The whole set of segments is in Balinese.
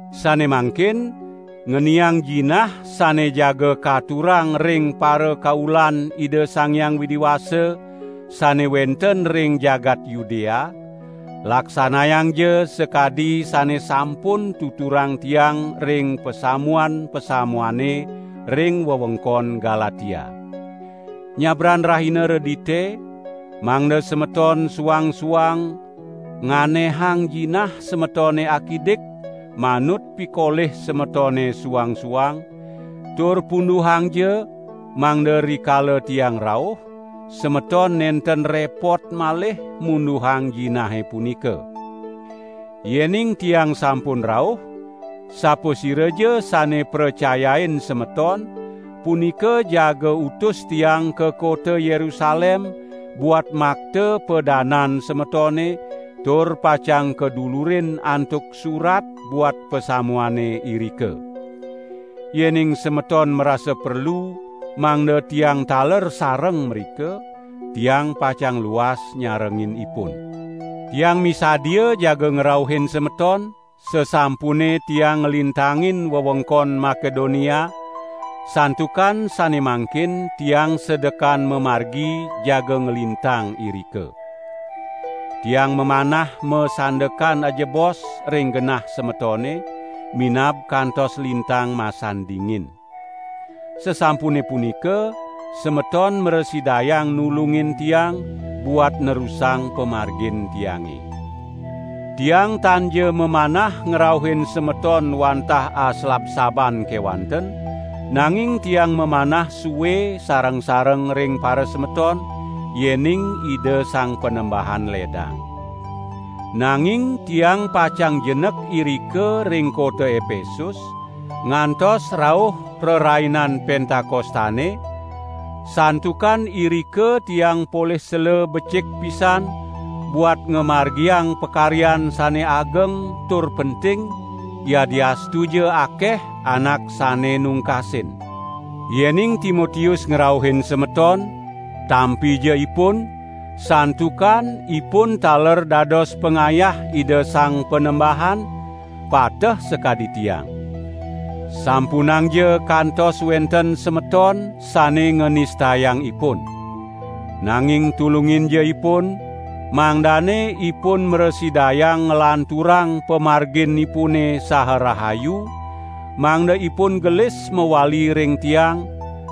Sane mangkin ngeniang jinah sane jaga katurang ring parakaulan Ida Sang Hyang Widi Wasa, sane wenten ring jagat Yudea, laksanayangja sakadi sane sampun tuturang tiang ring pasamuan-pasamuane ring wewengkon Galatia. Nyabran rahina Redite, mangda semeton suang-suang nganehang jinah semetone akidik manut pikolih semetone suang-suang, tur punduhangja, mangda rikala tiang rauh, semeton nenten repot malih munduhang jinahe punika. Yening tiang sampun rauh, sapasiraja sane pracayain semeton, punika jaga utus tiang ka kota Yerusalem buat makta padanan semetone tur pacang kadulurin antuk surat buat pasamuane irika. Yening semeton marasa perlu mangda tiang taler sareng mrika, tiang pacang luas nyarengin ipun. Tiang misadia jaga ngrauhin semeton, sasampune tiang nglintangin wewengkon Makedonia, santukan sane mangkin tiang sedekan mamargi jaga nglintang irika. Tiang mamanah masandekan ajebos ring genah semetone, minab kantos lintang masan dingin. Sasampune punika semeton mrasidayang nulungin tiang buat nerusang pamargin tiange. Tiang tanja mamanah ngrauhin semeton wantah aslabsaban kewanten, nanging tiang mamanah sue sareng-sareng ring parasemeton, yening Ida Sang Panembahan ledang. Nanging tiang pacang jenek irika ring kota Epesus, ngantos rauh Rerainan Pentakostane, santukan irika tiang polih sela becik pisan buat ngamargiang pakaryan sane ageng tur penting, yadiastuja akeh anak sane nungkasin. Yening Timotius ngrauhin semeton, tampija ipun, santukan ipun taler dados pangayah Ida Sang Panembahan, pateh sakadi tiang. Sampunangja kantos wenten semeton sane nganistayang ipun! Nanging tulunginja ipun, mangdane ipun mrasidayang nglanturang pamarginipune saha rahayu, mangda ipun gelis mawali ring tiang,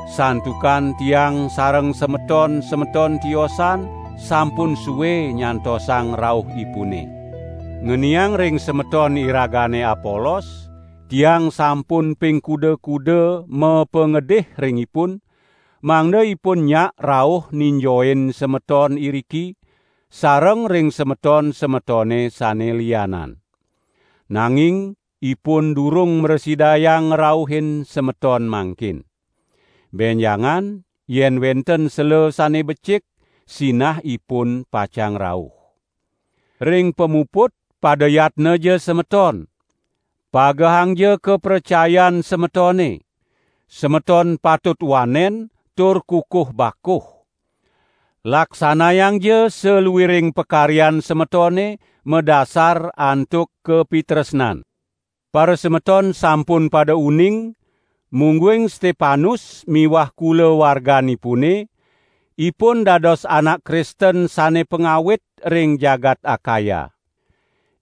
santukan tiang sareng semeton-semeton tiosan sampun sue nyantosang rauhipune. Ngeniang ring semeton iragane Apolos, tiang sampun ping kuda-kuda mapangedih ring ipun, mangda ipun nyak rauh ninjoin semeton iriki, sareng ring semeton-semetone sane lianan. Nanging ipun durung mrasidayang ngrauhin semeton mangkin. Benjangan yen wenten sela sane becik, sinah ipun pacang rauh. Ring pamuput pada yatnaja semeton! Pagehangja kapracayan semetone! Semeton patut wanen, tur kukuh bakuh! Laksanayangja saluiring pakaryan semetone madasar antuk kapitresnan. Parasemeton sampun pada uning, mungguing Stepanus miwah kulawarganipune, ipun dados anak Kristen sane pangawit ring jagat Akaya.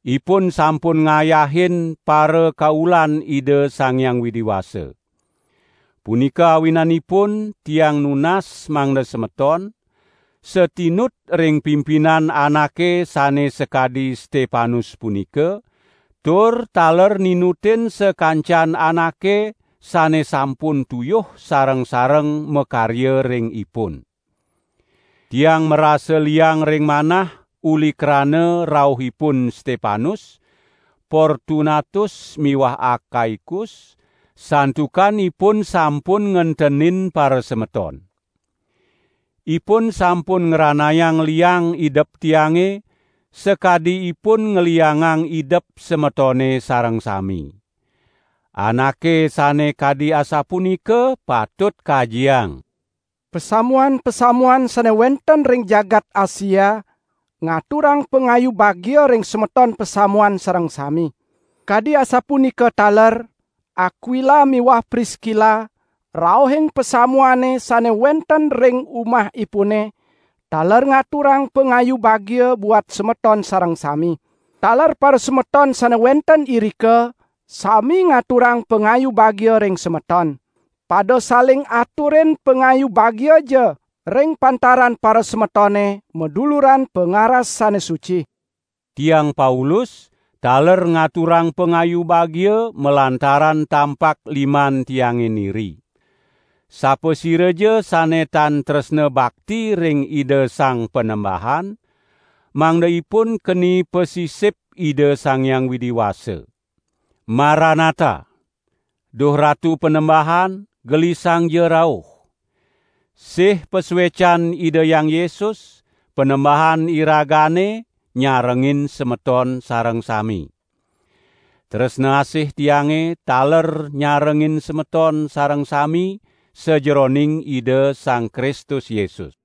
Ipun sampun ngayahin parakaulan Ida Sang Hyang Widi Wasa. Punika awinanipun tiang nunas mangda semeton, satinut ring pimpinan anake sane sakadi Stepanus punika, tur taler ninutin sakancan anake sane sampun tuyuh sareng-sareng makarya ring ipun. Tiang marasa liang ring manah uli krana rauhipun Stepanus, Portunatus miwah Akaikus, santukan ipun sampun ngentenin parasemeton. Ipun sampun ngranayang liang idep tiange, sakadi ipun ngliangang idep semetone sareng sami. Anake sane kadi asapunika patut kajiang. Pasamuan-pasamuan sane wenten ring jagat Asia ngaturang pangayu bagia ring semeton pasamuan sareng sami. Kadi asapunika taler Akwila miwah Priskila rauhing pasamuane sane wenten ring umahipune taler ngaturang pangayu bagia buat semeton sareng sami. Taler parasemeton sane wenten irika sami ngaturang pangayu bagia ring semeton. Pada saling aturin pangayu bagiaja ring pantaran parasemetone maduluran pangaras sane suci. Tiang Paulus taler ngaturang pangayu bagia malantaran tampak liman tiange niri. Sapasiraja sane tan tresna bakti ring Ida Sang Panembahan, mangda ipun keni pasisip Ida Sang Hyang Widi Wasa. Maranatha! Duh Ratu Panembahan, gelisangja rauh! Sih pasuecan Ida Hyang Yesus, Panembahan iragane nyarengin semeton sareng sami. Tresna asih tiange taler nyarengin semeton sareng sami sajeroning Ida Sang Kristus Yesus.